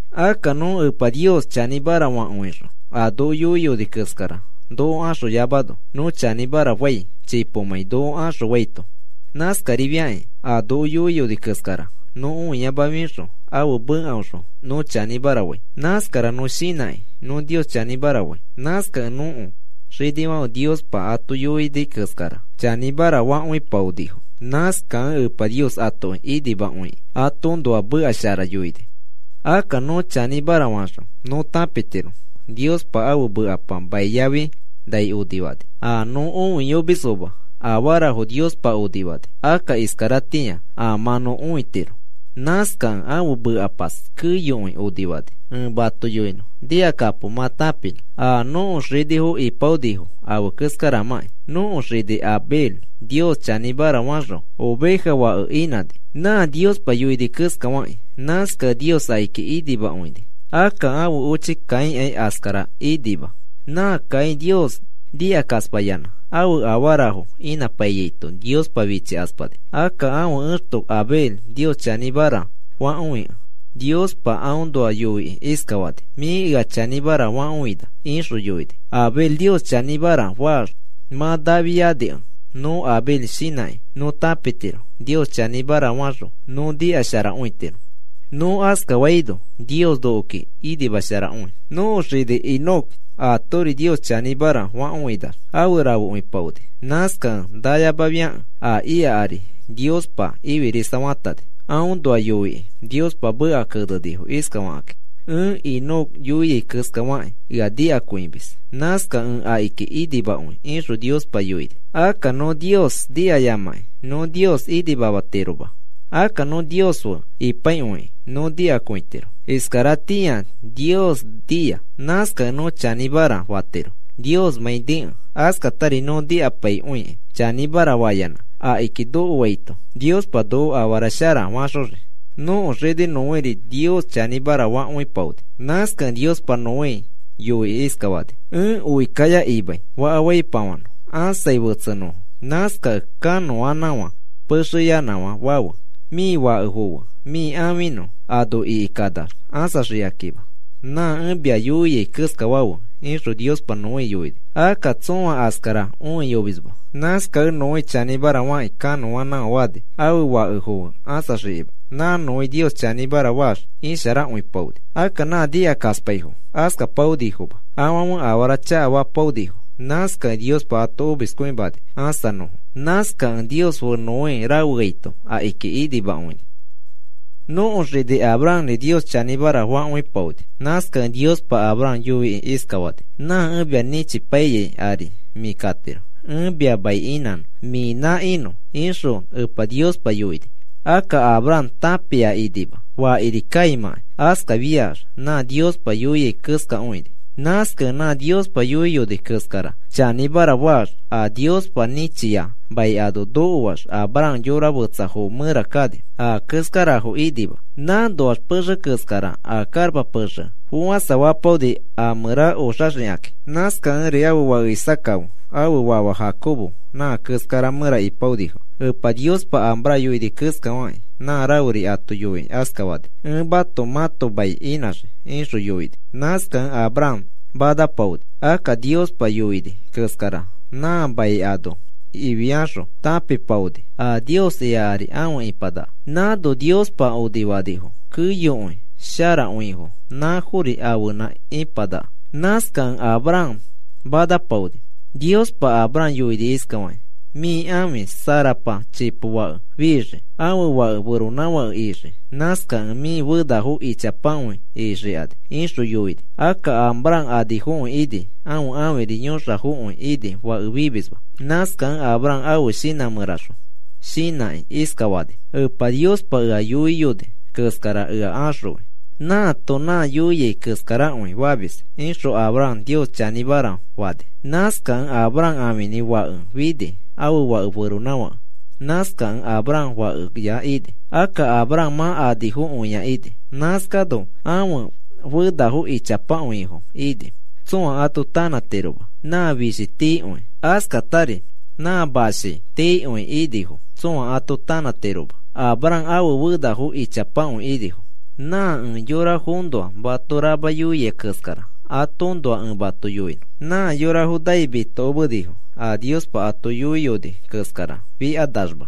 Akka nõ Epa Nios chanĩmara fakõixõ a noko yoiyoni keskara noko axoyoamano nõ chanĩmara fai chipomãi noko axõfaito. Nãskarifiakĩ a noko yoiyoni keskara nõ õiyamafixõ ãfe mekaõxõ nõ chanĩmara fai. Nãskara nõ shinãkĩ nõ Nios chanĩmara fai. Nãskakẽ nõko xinifãfe Niospa ato yoini keskara chanĩmara fakõipaonifo. Nãskakẽ Epa Nios atoki inimakõikĩ atoõnoa meka shara yoini. Akka nõ chanĩmara faxõ nõ tãpitiro Niospa ãfe mekapa mai yafi nai onifani. A nõ õiyomisfoma afarafo Niospa onifani, akka iskaratĩa mã nõ õitiro. Nãskakẽ ãfe mekapas keyokõi onifani. Ẽ mato yoinõ nikakapo mã tãpinõ a nõko xinifo ipaonifo afe keskaramãkĩ. Nõko xini Abel Nios chanĩmara faxõ oveja fake inãni nã Niospa yoini keskafakĩ. Nãskakẽ Nios akiki inimakõini. Akka ãfe ochi Caínkai askara inãnima. Nã Caín Nios nikakaspayanã ãfe afarafo inãpaiyaito Niospa fichikaspani. Akka ãfe exto Abel Nios chanĩmara fakõikẽ Niospa aõnoa yoikĩ iskafani: “Mĩ ea chanĩmara fakõina,” ixõ yoini. Abel Nios chanĩmara faax mã nafianikẽ nõ Abel shinãkĩ nõ tãpitiro Nios chanĩmara faxõ nõ nikasharakõitiro. Nõ askafaino Nios nokoki inimasharakõi. Nõko xini Enoc aatori Nios chanĩmara fakõinax afe rafekõipaoni. Nãskakẽ nayamafiakẽ a ika ari Niospa ifirisafatani. Aõnoa yoikĩ Niospa meka kenenifo iskafakĩ: “Ẽ Enoc yoiai keskafakĩ ea nikakõimis. Nãskakẽ ẽ akiki inimakõi,” ixõ Niospa yoini. Akka nõ Nios nikayamakĩ nõ Nios inimamatiroma. Akka nõ Nios fe ipaikõikĩ nõ nikakõitiro. Iskaratĩa Nios nia. Nãskakẽ nõ chanĩmara fatiro Niosmãi nikẽ. Askatari nõ nikapaikõikĩ chanĩmara fayanã akiki nokoaito Niospa noko afara shara faxoxii. Nõko xini Noéri Nios chanĩmara fakõipaoni. Nãskakẽ Niospa Noé yoikĩ iskafani: “Ẽ oi kaya imai faka faipafanõ ãsai fetsenõfo. Nãskakẽ kanõanãfã pexeya fafe. Mĩ fakefo fe mĩ ãfinõ ano ikanax ãsaxikanima. Nã ẽ mia yoiai keskafafe,” ixõ Niospa Noé yoini. Akka tsõa askara õiyomisma nãskakẽ Noé chanĩmara fakĩ kanõanãfã fani ãfe fakefo fe ãsaxikakima. Nã Noé Nios chanĩmara faax isharakõipaoni. Akka nã nikakaspaifo askapaonifoma, afãfe afara chakafapaonifo. Nãskakẽ Niospa ato omiskõimani ãsanõfo. Nãskakẽ Nios fe Noé rafeaito akiki inimakõini. Nõko xini Abrahamri Nios chanĩmara fakõipaoni. Nãskakẽ Niospa Abraham yoikĩ iskafani: “Nã ẽ mia nĩchipaiyai ari mĩ katiro. Ẽ mia mai inãnõ mĩnã inõ,” ixõ Epa Niospa yoini. Akka Abraham tãpia inima fakiri kaimãkai. Askafiax nã Niospa yoia keskakõini. Nãskakẽ nã Niospa yoiyoni keskara chanĩmara faax, a Niospa nĩchia mai ano nokoax Abraham yora fetsafo mẽra kani. A keskarafo inima. Nãnoax pexe keskara a karapa pexe fofãsafapaoni a mẽra oxaxikaki. Nãskakẽri ãfe fake Isaaca fe ãfe fafa Jacobo nã keskara mẽra ipaonifo. Epa Niospa Abraham yoini keskafakĩ nã raferi ato yoikĩ askafani: “Ẽ mato mãto mai inãxii,” ixõ yoini. Nãskakẽ Abraham manapaoni. Akka Niospa yoini keskara nã mai ano ifiaxõ tãpipaoni a Nios ika ari afe ipanaka. Nãno Niospa onifanifo keyokõi sharakõifo nãfori ãfenã ipanaka. Nãskakẽ Abraham manapaoni. Niospa Abraham yoini iskafaki: “Mĩ ãfi Sarapa chipo fake fixii. Ãfe fake feronãfake ixii. Nãskakẽ mĩ fenafo ichapakõi ixikani,” ixõ yoini. Akka Abraham anifokõi ini ãfe ãfiri yõxafokõi ini fake fimisma. Nãskakẽ Abraham ãfe shinã mẽraxõ shinãkĩ iskafani: “Epa Niospa ea yoiyoni keskara ea axõi. Nãato nã yoiai keskarakõi famis,” ixõ Abraham Nios chanĩmara fani. Nãskakẽ Abraham ãfinĩ fake fini, ãfe fake feronãfake. Nãskakẽ Abraham fakeya ini. Akka Abraham mã anifokõia ini. Nãskano ãfe fenafo ichapakõifo ini. Tsõa ato tanãtiroma. Nã fishifo tiikõi askatari nã mashi exe tiikõi inifo tsõa ato tanãtiroma. Abraham ãfe fenafo ichapakõi inifo. Nã ẽ yorafoõnoa mato rama yoia keskara atoõnoa ẽ mato yoinõ. Nã yorafo nai mitokomenifo a Niospa ato yoiyoni keskara fikanaxma.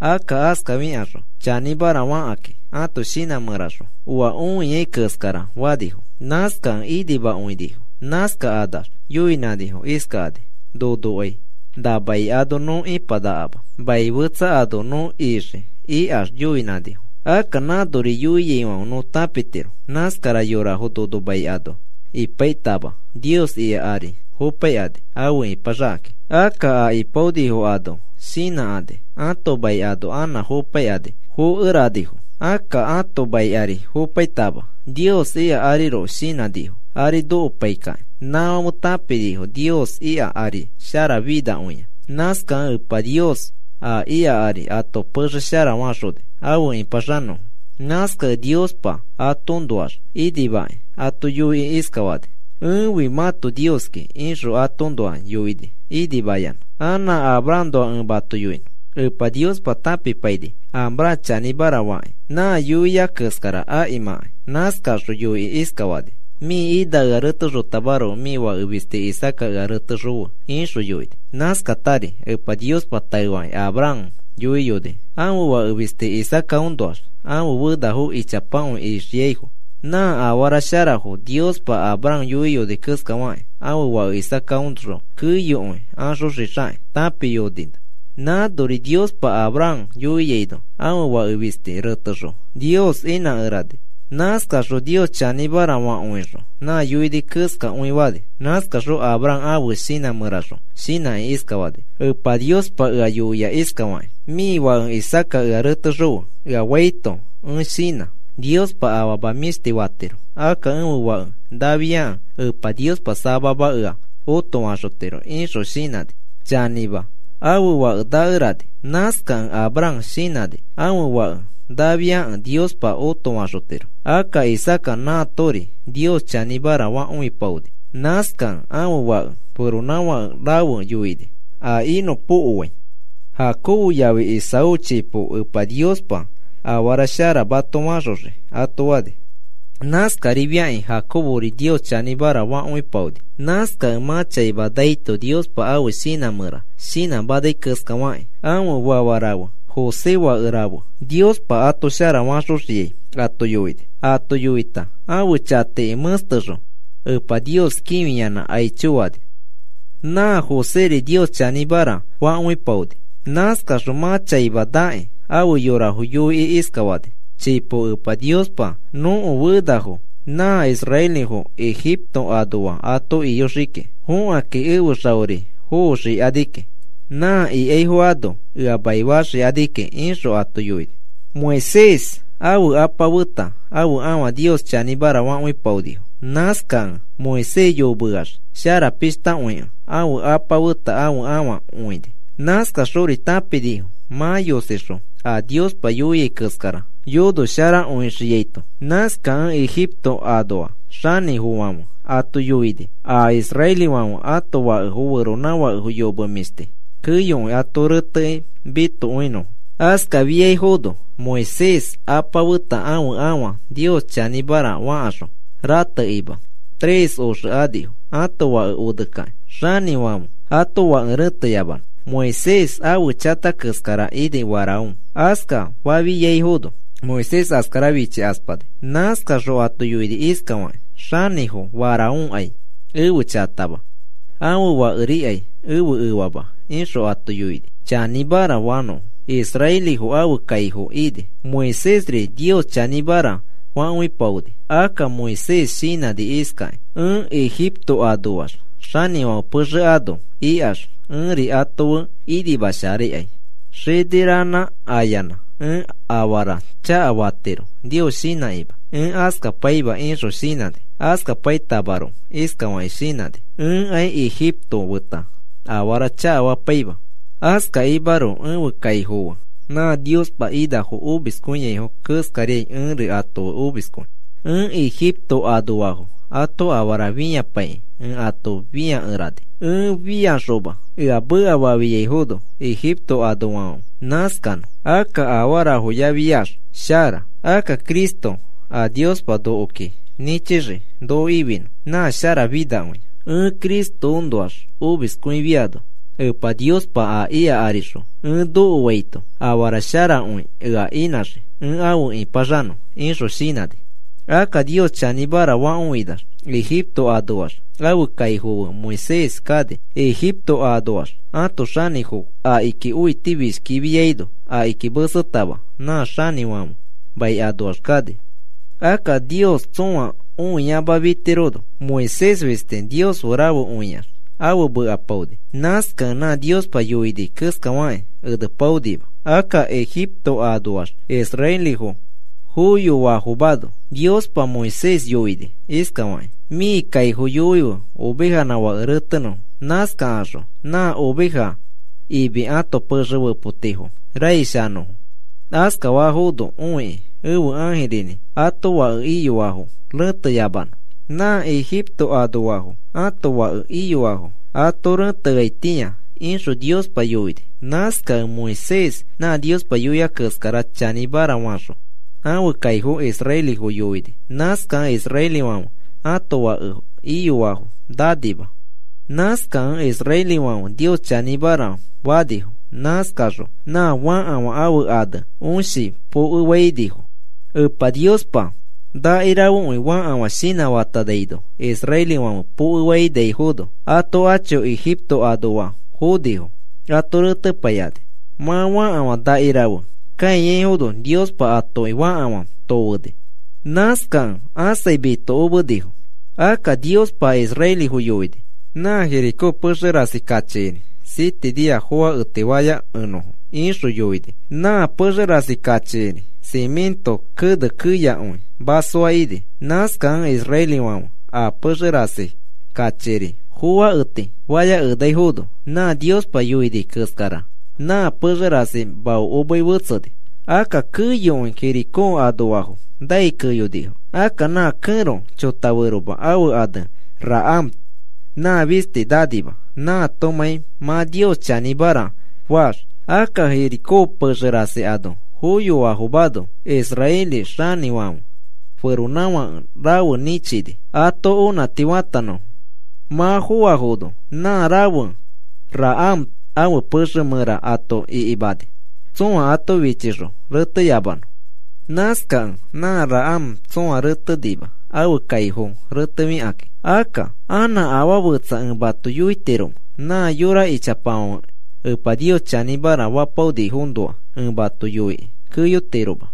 Akka askafikaxõ chanĩmara fakakĩ ato shinã mẽraxõ oa õiai keskara fanifo. Nãskakẽ inimakõinifo. Nãskakanax yoinãnifo iskakani: “Nonokai na mai ano nõ ipanakama, mai fetsa ano nõ ixii,” ikax yoinãnifo. Akka nãnori yoiaifãfe nõ tãpitiro nãskara yorafo nono mai ano ipaitama Nios ika ari fopaikani afe ipaxakakĩ. Akka a ipaonifo ano shinãkani ãto mai ano anã fopaikani fokeranifo. Akka ãto mai ari fopai atama Nios ika ariroko shinãnifo ari nokopaikakĩ. Nãfãfe tãpinifo Nios ika ari sharafinakõia. Nãskakẽ Epa Niospa a ika ari ato pexe shara faxoni afe ĩpaxanõfo. Nãskakẽ Niospa atoõnoax inimakĩ ato yoikĩ iskafani: “Ẽfi mãto Nioski,” ixõ atoõnoa yoini inimayanã. Anã Abrahamnoa ẽ mato yoinõ. Epa Niospa tãpipaini Abraham chanĩmara fakĩ nã yoia keskara akimãkai. Nãskaxõ yoikĩ iskafani: “Mĩ ina ea retexotamaroko mĩ fake fisti Isaaca ea retexõfe,” ixõ yoini. Nãskatari Epa Niospa taefakĩ Abraham yoiyoni ãfe fake fisti Isaacaõnoax ãfe fenafo ichapakõi ixiaifo. Nã afara sharafo Niospa Abraham yoiyoni keskafakĩ ãfe fake Isaacaõxõ keyokõi axoxixakĩ tãpimayoni. Nãnori Niospa Abraham yoiaino ãfe fake fisti retexõ Nios inãkerani. Nãskaxõ Nios chanĩmara fakõixõ nã yoini keskakõi fani. Nãskaxõ Abraham ãfe shinã mẽraxõ shinãkĩ iskafani: “Epa Niospa ea yoia iskafakĩ: ‘Mĩ fake Isaaca ea retexõfe,’ ea faito ẽ shinã Niospa afama mĩshti fatiro. Akka ẽfe fake nafiakẽ Epa Niospa samama ea otofaxotiro,” ixõ shinãni. Chanĩma, ãfe fake nakerani. Nãskakẽ Abraham shinãni ãfe fake nafiakẽ Niospa otofaxotiro. Akka Isaaca nãatori Nios chanĩmara fakõipaoni. Nãskakẽ ãfe fake feronãfake rafe yoini a inõpokoai: “Jacobo yafi Esaú, chipo Epa Niospa afara shara mato faxoxii,” ato fani. Nãskarifiakĩ Jacobori Nios chanĩmara fakõipaoni. Nãskakẽ mã chaima naito Niospa ãfe shinã mẽra shinãmanai keskafakĩ ãfe fafa rafe, José fake rafe, Niospa ato shara faxonõpokofai ato yoini. Ato yoita ãfe chatiki mẽstexõ Epa Nios kĩfiyanã aicho fani. Nã Joséri Nios chanĩmara fakõipaoni. Nãskaxõ mã chaima nakĩ ãfe yorafo yoikĩ iskafani: “Chipo Epa Niospa nõko fenafo nã israelifo Ejipto anoa ato iyoxii kiki. Fokakĩ ẽfe xaori foxikani kiki. Nã ikaifo ano ea maifaifoxikakĩ,” ixõ ato yoiyoni. Moisés ãfe apa feta ãfe afa Nios chanĩmara fakõipaonifo. Nãskakẽ Moisés yomeax sharapishtakõikẽ ãfe apa feta ãfe afa õini. Nãskaxori tãpinifo mã yosixõ a Niospa yoiai keskara yonosharakõixiaito. Nãskakẽ Ejipto anoa xanĩfãfe ato yoini a israelifãfe ãto fake feronãfake yome mĩshti keyokõi ato rẽtekĩ mitokakõinõfo. Askafiaifono Moisés ãfe apa feta ãfe afa Nios chanĩmara fakaxõ ratekakima tres oxe anifo ãto fake onekakĩ xanĩfãfe ãto fake rẽteyamanõ. Moisés ãfe chata keskara ini Faraón. Askafafiaifono Moisés askara fichikaspani. Nãskaxõ ato yoini iskafakĩ: “Xanĩfo Faraónkai ẽfe chatama. Ãfe fakerikai ẽfe efama,” ixõ ato yoini, chanĩmara fanõfo israelifo ãfe kaifo ini. Moisésri Nios chanĩmara fakõipaoni. Akka Moisés shinãni iskakĩ: “Ẽ Ejipto anoax xanĩfãfe pexe ano ikax ẽri ato fe inimasharakai xini ranã ayanã ẽ afara chakafatiro Nios shinãyamakĩ. Ẽ askapaima,” ixõ shinãni. Askapaitamaroko iskafakĩ shinãni: “Ẽkai ejiptofo feta afara chakafapaima, askakimaroko ẽfe kaifo fe nã Niospa inafo omiskõiaifo keskai ẽri ato fe omiskõi. Ẽ Egipto anoafo ato afara fĩapaikĩ ẽ ato fĩakerani. Ẽ fĩaxoma, ea mekafafiaifono Egipto anoafãfe, nãskanõ. Akka afarafoyafiax shara. Akka Cristo, a Niospa noko nĩchixii noko ifinõ, nã sharafinakõia. Ẽ Cristoõnoax omiskõifiano Epa Niospa a ika arixõ ẽ nokoaito afara sharakõi ea inãxii ẽ afe ĩpaxanõ,” ixõ shinãni. Akka Nios chanĩmara fakõinax Ejipto anoax ãfe kaifo fe Moisés kani. Ejipto anoax ãto xanĩfo akiki õitifishkifiaino akiki mesetama nã xanĩfãfe mai anoax kani. Akka Nios tsõa õiyamafitirono Moisés fisti Nios fe rafekõiax afe mekapaoni. Nãskakẽ nã Niospa yoini keskafakĩ enepaonima. Akka Ejipto anoax israelifo foyoafomano Niospa Moisés yoini iskafakĩ: “Mĩ kaifo yoife ovejanã fake retenõfo. Nãskakaxõ nã oveja imi ãto pexe fepotifo raish anõfo, askafafono õiki ẽfe ãjirinĩ ãto fake iyoafo rẽteyamanõ, nã Ejipto anoafo ãto fake iyoafo ato reteaitĩa,” ixõ Niospa yoini. Nãskakẽ Moisés nã Niospa yoia keskara chanĩmara faxõ ãfe kaifo israelifo yoini. Nãskakẽ israelifãfe ãto fake iyoafo nanima. Nãskakẽ israelifãfe Nios chanĩmara fanifo. Nãskakaxõ nã fakafã ãfe ane Õshi pokefainifo. Epa Niospa nẽxpakĩa fakafã shinãfatanaino israelifãfe pokefainaifono ato acho Ejipto anoafo fonifo ato retepaikani. Mã fakafã nẽxpakĩa kãiyaifono Niospa atoki fakafã yosifani. Nãskakẽ ãsai mitokomenifo. Akka Niospa israelifo yoini: “Nã Jericó pexe rasi kachiori siete nia foaketi fayakenõfo,” ixõ yoini. Nã pexe rasi kachiori simĩto kene keyakõi masoa ini. Nãskakẽ israelifãfe a pexe rasi kachiori foaketi fayakenaifono nã Niospa yoini keskara nã pexe rasi maokomei fetseni. Akka keyokõi Jericó anoafo nai keyonifo. Akka nã kẽro chotaferoma ãfe ane Rahab nã fisti nanima nãatomãi mã Nios chanĩmara faax. Akka Jericó pexe rasi ano foyoafomano israeli xanĩfãfe feronãfake rafe nĩchini ato onãti fatanõfo. Mã foafono nã rafe Rahab ãfe pexe mẽra ato ikimani tsõa ato fichixõ reteyamanõ. Nãskakẽ nã Rahab tsõa retenima ãfe kaifo retefikakĩ. Akka, ¿anã afaa fetsa ẽ mato yoitiromẽ? Nã yora ichapafãfe Epa Nios chanĩmara fapaonifoõnoa ẽ mato yoikĩ keyotiroma.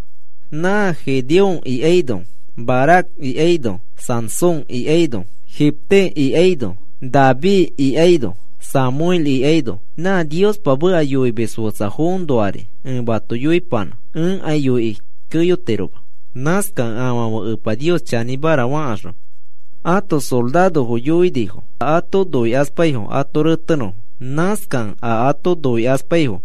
Nã Gedeón ikaino, Barac ikaino, Sansón ikaino, Jefté ikaino, David ikaino, Samuel ikaino nã Niospa meka yoimis fetsafoõnoari ẽ mato yoipanã ẽkai yoikĩ keyotiroma. Nãskakẽ afãfe Epa Nios chanĩmara fakaxõ ãto sorarofo yoinifo a ato noikaspaifo ato retenõfo. Nãskakẽ a ato noikaspaifo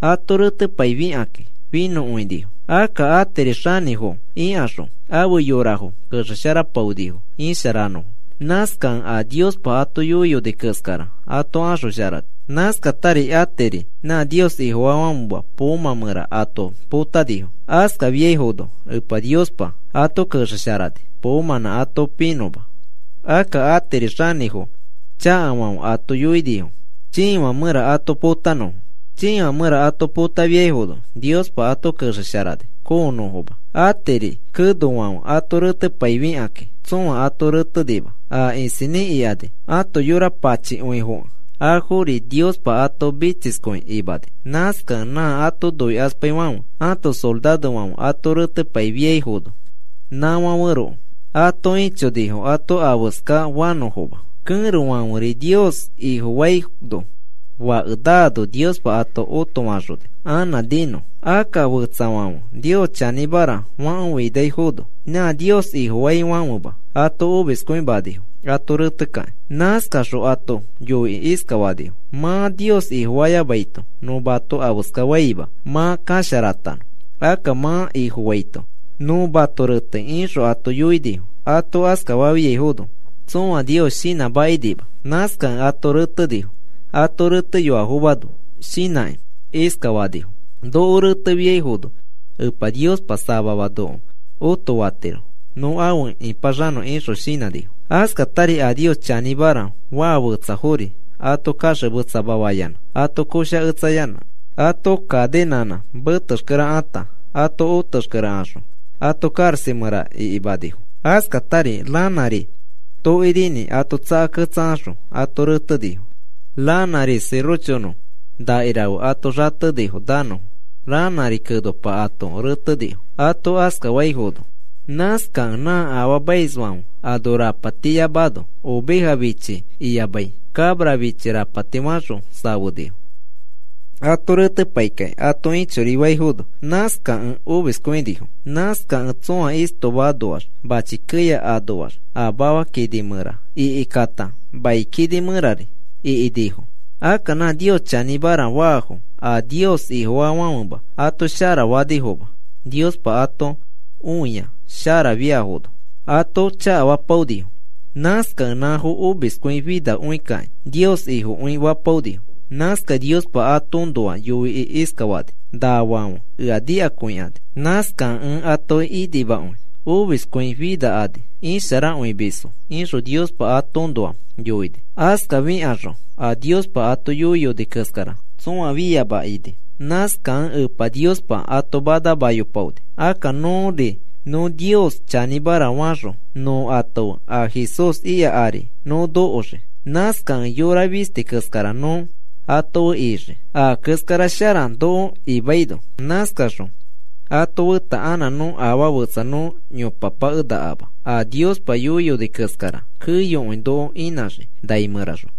ato retepaifikakĩ finõkõinifo. Akka atiri xanĩfo ikaxõ ãfe yorafo kexesharapaonifo isharanõfo. Nãskakẽ a Niospa ato yoiyoni keskara ato axosharani. Nãskatari atiri nã Nios Ifofaafãfema poomã mẽra ato potanifo. Askafiaifono Epa Niospa ato kexesharani poomãnã ato pinõma. Akka atiri xanĩfo chakafãfe ato yoinifo chiifã mẽra ato potanõfo. Chii mẽra ato potafiafono Niospa ato kexesharani koonõfoma. Atiri kenofãfe ato retepaifikakĩ tsõa ato retenima. A isinĩ ikani ato yora pachikõifokẽ afori Niospa ato mitsiskõi imani. Nãskakẽ nã ato noikaspaifãfe ãto sorarofãfe ato retepaifiaifono nãfãferoko ato ĩchonifo ato afeskafanõfoma. Kẽrofãferi Nios Ifofaino, fake naano Niospa ato otofaxoni anã ninõ. Akka fetsafo Nios chanĩmara fakõinafono nã Nios Ifofaifãfema ato omiskõimanifo ato retekakĩ. Nãskaxõ ato yoikĩ iskafanifo: “Mã Nios Ifofayamaito nõ mato afeska faima mã kasharatanõ. Akka mã Ifofaito nõ mato retei,” ixõ ato yoinifo. Ato askafafiaifono tsoa Nios shinãmakinima. Nãskakẽ ato retenifo ato reteyoafomano shinãkĩ iskafanifo: “Noko retefiaifono Epa Niospa samama noko õtofatiro nõ afe ĩpaxanõ,” ixõ shinãnifo. Askatari a Nios chanĩmara faa fetsafori ato kaxemetsamafayanã ato koshaketsayanã ato cadenãnã metexkere ata ato otexkere axõ ato karaxa mẽra ikimanifo. Askatari ranãri tokirinĩ ato tsakaketsakaxõ ato retenifo, ranãri sirochonõ nakirafe ato xatenifo nanõfo, ranãri kenopa ato retenifo, ato askafaifono. Nãskakẽ nã afaamaisfãfe ano rapatiyamano oveja fichi iyamai cabra fichi rapati fakaxõ safenifo. Ato retepaikakĩ ato ĩchorifaifono. Nãskakẽ omiskõikõinifo. Nãskakẽ tsõa istoma anoax machi keya anoax a mafa kini mẽra ikikata mai kini mẽrari ikinifo. Akka nã Nios chanĩmara faafo a Nios Ifofaafãfema ato shara fanifoma Niospa ato õia sharafiafono, ato chakafapaonifo. Nãskakẽ nãfo omiskõi finafikakĩ Nios Ifokõi fapaonifo. Nãskakẽ Niospa atoõnoa yoikĩ iskafani: “Nafãfe ea nikakõikani. Nãskakẽ ẽ atoki inimakõi omiskõifikani isharakõimisfo,” ixõ Niospa atoõnoa yoini. Askafikaxõ a Niospa ato yoiyoni keskara tsõa fiama ini. Nãskakẽ Epa Niospa ato manamayopaoni. Akka nõri nõ Nios chanĩmara faax nõ ato fe a Jesús ika ari nõ nokoxii. Nãskakẽ yora fisti keskara nõ ato fe ixii a keskara shara noko imaino. Nãskaxõ ato feta anã afaa fetsa nõ yopapakenakama. A Niospa yoiyoni keskara keyokõi noko inãxii nai mẽraxõ.